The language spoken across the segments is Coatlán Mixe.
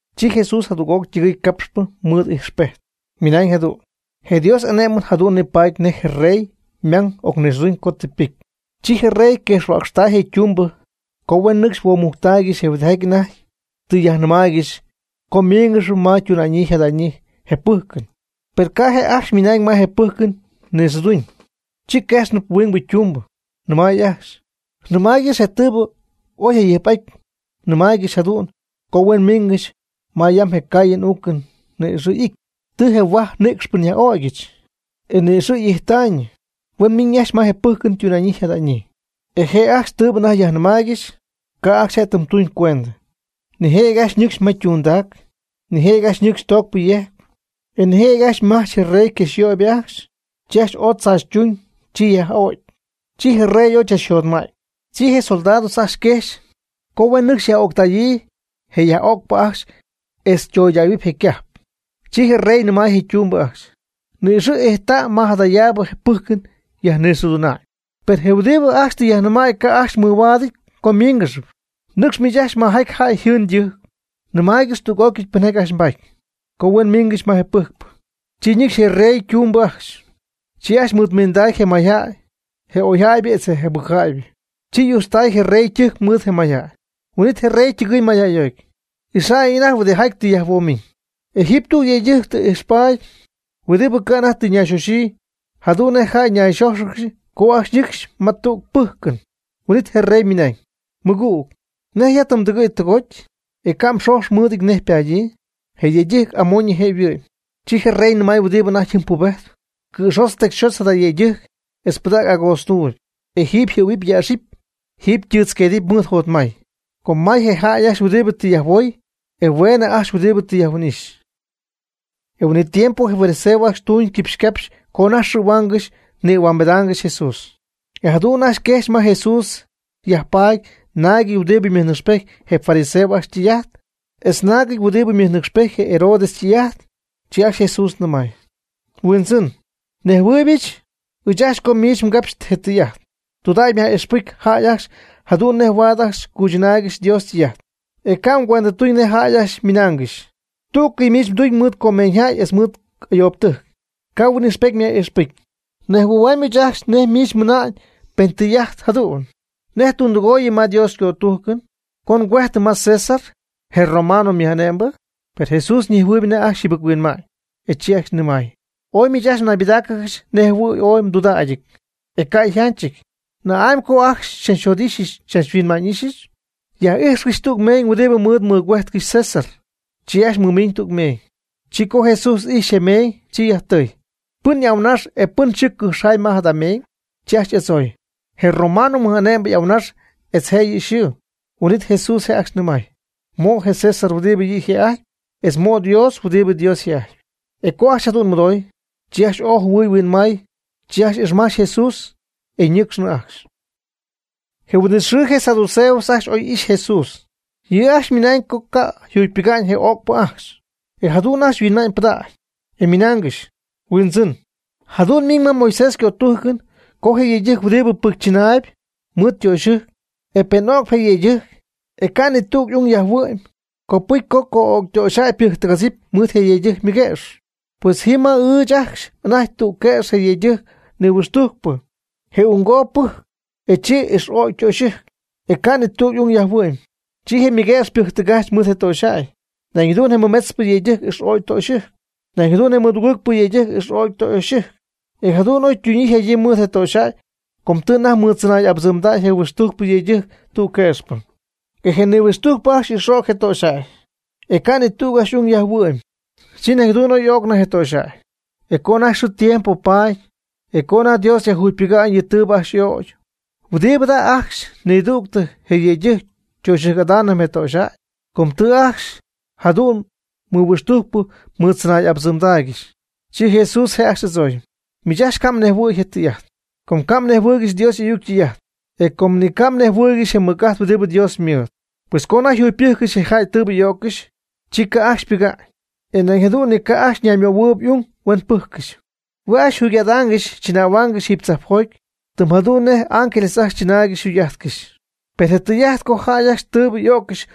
Chi Jesús jadüg'oc ytɨgɨɨy capxp mɨɨd ijxpejt, ymɨnañ jadu'n: ―Je Dios y'ane'mɨn jadu'n nipaady nej je rey ymang ocnixɨɨduñ co tɨ ypɨcy. Chi je rey quejxhuäcxtay je ytumbɨ co huen nɨcxy huoomujctaaygɨxy je huɨdijaty anajty tɨ yaj'nɨmaaygɨxy co míingɨxɨpy ma ytuna'ñyii yjada'ñyii je pɨjcɨn. Per ca' je' ajcxy ymiina'ñ ma je pɨjcɨn nixɨɨduñ. Chi quejxnɨp huingbɨ ytumbɨ, nɨmay ajcxy: “Nɨmaaygɨx je tɨɨbɨ oy jayɨjp'aty mnɨmaaygɨx jadu'n co huen mmiingɨxy ma yam je caayɨn uucɨn ni'ixɨ' y'ity. Tɨ je huaj nïcxpɨ nyaj'ögyɨch. E ni'ixɨ' ijttaayñɨ, huen miiñ ajcxy ma je pɨjcɨn ytuna'ñyii yjada'ñyii.” E je' ajcxy tɨɨbɨ anajty yaj'nɨmaaygɨxy, ca' ajcxy je' ytɨmy tuñ cuendɨ. Nijëjɨty ajcxy ñɨcxy ma ytundac. Nijëjɨty ajcxy ñɨcxy toocp yejcp; e nijëjɨty ajcxy majch je rey yquejxyöybɨ ajcxy, chi ajcxy oy chaachytuñ, chi yaj'o'cy. Chi je rey ooy chachjotma'ty. Chi je soldados ajcxy quejxy co huen nɨcxy yaj'öctäyii je jäyyaj'öcp ajcxy etz ytoydähuɨp je ycajp. Chi je rey nɨmay je ytumbɨ ajcxy: “Ni'ixɨ' ijttäy ma jadayaabɨ je pɨjcɨn yajnixɨɨduna'ñ. Per je huɨdibɨ ajcxy tɨ yajnɨmäy ca' ajcxy mɨhuaadɨty co ymíingɨxɨpy. Nɨcx miich ajcxy majaty jäy yjɨɨn ytɨjc. Nɨmaaygɨxy tüg'ócɨy pɨnjaty ajcxy mbaty, co huen miingɨxy ma je pɨjcpɨ.” Chi ñɨcxy je rey ytumbɨ ajcxy. Chi ajcxy mɨɨdmiinday je mayjäy, je oyjäybɨ etz je jɨbɨcjäybɨ. Chi y'ujtztay je rey ytɨjc mɨɨd je mayjäy. Huin'it je rey ytɨgɨɨy mayjäyjoty, ixa'ñ anajty huɨdijaty tɨ yajhuomiñ. E jiiby tüg yëydɨjc tɨ ijxpaty huɨdibɨ ca' anajty tɨ ñayxoxyii, jadu'n nej jäy nayxójxɨgɨxy co ajcxy nɨcxy ma tüg pɨjcɨn. Huin'it je rey mɨnañ: “Mɨgüg, ¿nej ya tɨ mdɨgɨ̈y tɨgoty, e ca' mxojx mɨɨdɨty nej ypaadyii?” E je yëydɨjc amoñyɨ je' yhuɨ'my. Chi je rey nɨmay huɨdibɨ anajty jɨm pubejtp: “Cɨ̈xotz tecyxotz jada yëydɨjc etz pɨdäg agootztuuby. E jiiby yjɨ̈huɨpy yäxɨpy, jiiby ytɨɨtz huinqueedɨp mɨɨd jotmay.” Com may je jäy ajcxy huɨdibɨ tɨ yajhuooy, e hueenɨ ajcxy huɨdibɨ tɨ yajhuin'ixy. Je huin'it tiempo je fariseos ajcxy tuuñ quipxycapxy co anajty xɨ̈huaangɨxy nïhuambedaangɨxy Jesús. E jadu'n ajcxy quejxy ma Jesús yajpaady naagɨty huɨdibɨ mɨnɨcxpejt je fariseos ajcxy ytɨy'ajt etz naagɨty huɨdibɨ mɨjnɨcxpejt je Herodes ytɨy'ajt. Chi ajcxy Jesús nɨmay: ―Huindzɨn, nejhuɨɨybɨch ɨɨch ajcxy co miich mgapxy je tɨy'ajt. Tudägy myaj'ixpɨcy jäy ajcxy jadu'n nej huaad ajcxy cuychɨnaaygɨxy Dios ytɨy'ajt. E ca' mgüendɨtuñ nej jäy ajcxy ymɨnaangɨxy. Tú'cɨy miich mduñ mɨɨd comeeñyjäy etz mɨɨd ayoobtɨjc, ca' huin'ixpety myaj'ixpɨcy. Nejhuɨ̈huamy ɨɨch ajcxy nej miich mɨna'ñ pen tɨy'ajt jadu'n: ¿Nej ndundɨgooyɨm ma Dios ycötujcɨn, co ngüejtɨm ma César, je romano mɨj'ane'mbɨ? Per Jesús ñejhuɨɨyb anajty ajcxy yjɨbɨc-huinma'ñ, e chi ajcxy nɨmay: ―Ooy miich ajcxy naybɨdáacɨgɨxy nej jɨhuɨ̈y ooy mdudägyɨty, e ca' yjanchɨty. ¿Na'amy co ajcxy xychachjot'ixy xychachhuinma'ñ'ixyɨch? Yaj'ijxcɨch tüg meeñ huɨdi mɨɨd mɨgüéjtɨgɨxy César. Chi ajcxy mɨmiiñ tüg meeñ. Chi co Jesús y'ijxy je meeñ, chi yajtɨɨy: ―¿Pɨn y'ahuɨnax e pɨn yxɨɨ cɨxjaay ma jada meeñ? Chi ajcxy y'adzooy: ―Je romano mɨj'ane'mbɨ y'ahuɨnax etz yɨ' yxɨɨ. Huin'it Jesús je' ajcxy nɨmay: ―Mo' je César huɨdibɨ yɨ' yjë'ajtpy, etz mo' Dios huɨdibɨ Dios yjë'ajtpy. E co ajcxy jadu'n mɨdooy, chi ajcxy ooy jɨhuɨɨy huinmay. Chi ajcxy ixmajch Jesús, e ñɨcxnɨ ajcxy. Je huin'it xɨɨ je saduceos ajcxy oy ixy Jesús. Yɨ' ajcxy ymɨna'ñ co ca' yjugypɨga'ñ je öcpɨ ajcxy. E jadu'n ajcxy huinma'ñ pɨdägy, e ymɨnaangɨxy: ―Huindzɨn, jadu'n miiñ ma Moisés ycötújcɨn co je yëydɨjc huɨdibɨ ypɨjcychɨnaayb mɨɨd ytöxyɨjc, e pen öcp je yëydɨjc, e ca' ni tüg y'ung yajhuɨ'my, copɨcy co co'öcytöxyjäy ypɨjctɨgadzɨpy mɨɨd je yëydɨjc ymɨguëx. Pues jii ma ɨɨch ajcxy anajty tüg quëx je yëydɨjc nihuɨxtujc. Je unggoob ypɨjcy, e chi ix'ögy ytöxyɨjc, e ca' ni tüg y'ung yajhuɨ'my. Chi je mɨguëx ypɨjctɨgajch mɨɨd je töxyjäy. Nañ jadu'n je mɨmetzpɨ yëydɨjc ix'o'cy ytöxyɨjc. Nañ jadu'n je mɨdugɨɨgpɨ yëydɨjc ix'o'cy ytöxyɨjc. E jadu'n oytuñyii yjadyii mɨɨd je töxyjäy co tɨ anajty mɨɨddzɨnay'abɨdzɨmdäy je nihuɨxtujcpɨ yëydɨjc tüg quëxpɨ. E je nihuɨxtujcpɨ ajcxy ix'o'cy je töxyjäy, e ca' ni tüg y'ung ajcxy yajhuɨ'my. Chi nañ jadu'n oy y'öcnɨ je töxyjäy. E co anajty xɨɨ tiempo paty, co anajty Dios yajjugypɨcy yɨ tɨɨbɨ ajcxy y'ögy, ¿huɨdibɨ jada' ajcxy nidügtɨ je yëydɨjc töxyɨjc'adaanɨp je töxyjäy? Com tɨ ajcxy jadu'n nihuɨxtujcpɨ mɨɨddzɨnay'abɨdzɨmgɨxy. Chi Jesús je' ajcxy y'adzooy: ―Miich ajcxy ca' mhuinjɨhuɨ̈y je tɨy'ajt, com ca' mnejhuɨɨygɨxy Dios y'ayuc ytɨy'ajt, e com ni ca' mnejhuɨɨygɨxy je mɨc'ajt huɨdibɨ Dios ymɨɨd. Pues co anajty yjugypɨjccɨxy je jäy tɨɨbɨ y'öccɨxy, chi ca' ajcxy ypɨga'ñ, e nañ jadu'n ni ca' ajcxy ñaymöhuɨɨyb y'ung huen pɨjccɨxy. Hue' ajcxy yjugy'adaangɨxy chɨnähuaangɨxy jiiby tzajpjoty, tɨm jadu'n nej je ángeles ajcxy chɨnaaygɨxy jugy'ajtcɨxy. Per je tɨy'ajt co jäy ajcxy tɨɨbɨ y'öccɨxy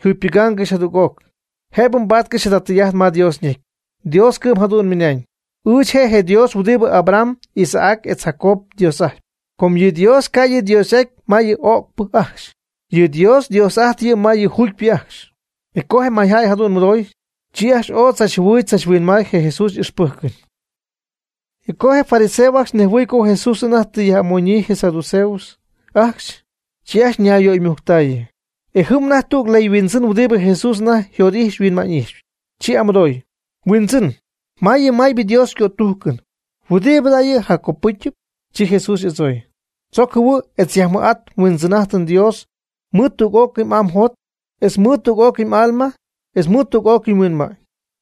yjucypɨgaangɨxy jadüg'oc, jëbɨ mbaatcɨxy jada tɨy'ajt ma Dios ñecy. Dios cɨ'm jadu'n mɨnañ: “Ɨɨch je' je Dios huɨdibɨ Abraham, Isaac etz Jacob yDios'ajtpy.” Com yɨ Dios ca' yɨ' yDios'aty ma yɨ öcpɨ ajcxy. Yɨ Dios Dios'ajtp yɨ' ma yɨ juugypɨ ajcxy. E co je mayjäy jadu'n mɨdooy, chi ajcxy ooy tzachjɨhuɨɨy tzachhuinmaay je Jesús y'ixpɨjcɨn. E co je fariseos ajcxy nejhuɨɨy co Jesús anajty tɨ yaj'amoñyii je saduceos ajcxy, chi ajcxy ñayyöymujctaayɨ. E jɨm anajty tüg leyhuindzɨn huɨdibɨ Jesús anajty jot'ijxyp huinma'ñ'ijxyp, chi y'amɨdooy: ―Huindzɨn, ¿ma yɨ maybɨ Dios ycötujcɨn, huɨdibɨ yɨ' jaccopɨcyɨp? Chi Jesús y'adzooy: ―Tzoc jɨhuɨ' etz yajmɨj'at nHuindzɨn'ajtɨm Dios mɨɨd tüg'ócɨy m'aa mjot, etz mɨɨd tüg'ócɨy m'alma, etz mɨɨd tüg'ócɨy mhuinma'ñ.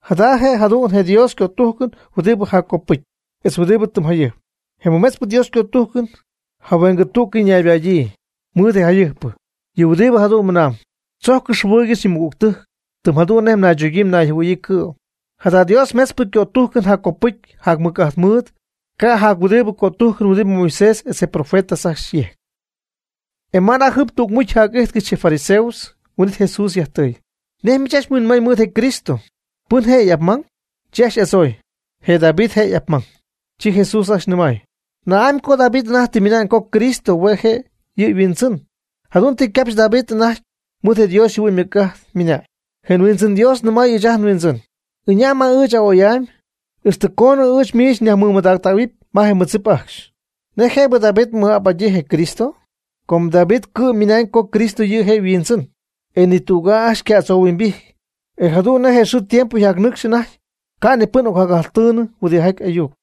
Jada je' jadu'n je Dios ycötujcɨn huɨdibɨ jaccopɨcyɨp, etz huɨdibɨ tɨm jayɨjpɨp. Je mɨmetzpɨ Dios ycötujcɨn jahueengɨ tú'cɨy ñaybadyii mɨɨd je jayɨjpɨ, yɨ' huɨdibɨ jadu'n mɨnamb: “Tzojccɨx jɨhuɨɨygɨx yɨ mmɨgügtɨjc, tɨm jadu'n nej mnaychogyii nayjɨhuɨ̈yii cɨ'm.” Jada Dios metzpɨ ycötujcɨn jaccopɨcy jacmɨc'ajt mɨɨd ca' jac huɨdibɨ cötujcɨn huɨdibɨ Moisés etz je profetas ajcxy yejc. E ma anajty jɨm tügmucy yjac'ijtcɨxy je fariseos, huin'it Jesús yajtɨɨy: ―¿Nej miich ajcxy huinmay mɨɨd Cristo? ¿Pɨn je' y'apmang? Chi ajcxy y'adzooy: ―Je David je' y'apmang. Chi Jesús ajcxy nɨmay: ―¿Na'amy co David anajty tɨ ymɨna'ñ co Cristo hue' je' yɨ' yhuindzɨn? Jadu'n tɨ capxy David anajty mɨɨd je Dios yjɨhuɨ'ñ ymɨc'ajt, ymɨnañ: Je Huindzɨn Dios nɨmay ɨɨch nHuindzɨn: “Ɨña' ma ɨɨch n'a'oy'amy, ixtɨ coonɨ ɨɨch miich nyajmɨmadägɨp ma je mmɨdzip ajcxy.” ¿Nej jëbɨ David ymɨj'ap'adyii je Cristo? Com David cɨ'm ymɨnañ co Cristo yɨ' je' yhuindzɨn. E nitüg'aa ajcxy yca'adzohuimbijty. E jadu'n nej je xɨɨ tiempo yjacnɨcx anajty ca' ni pɨn ocjacyajtɨɨyñɨ huɨdijaty ayuc.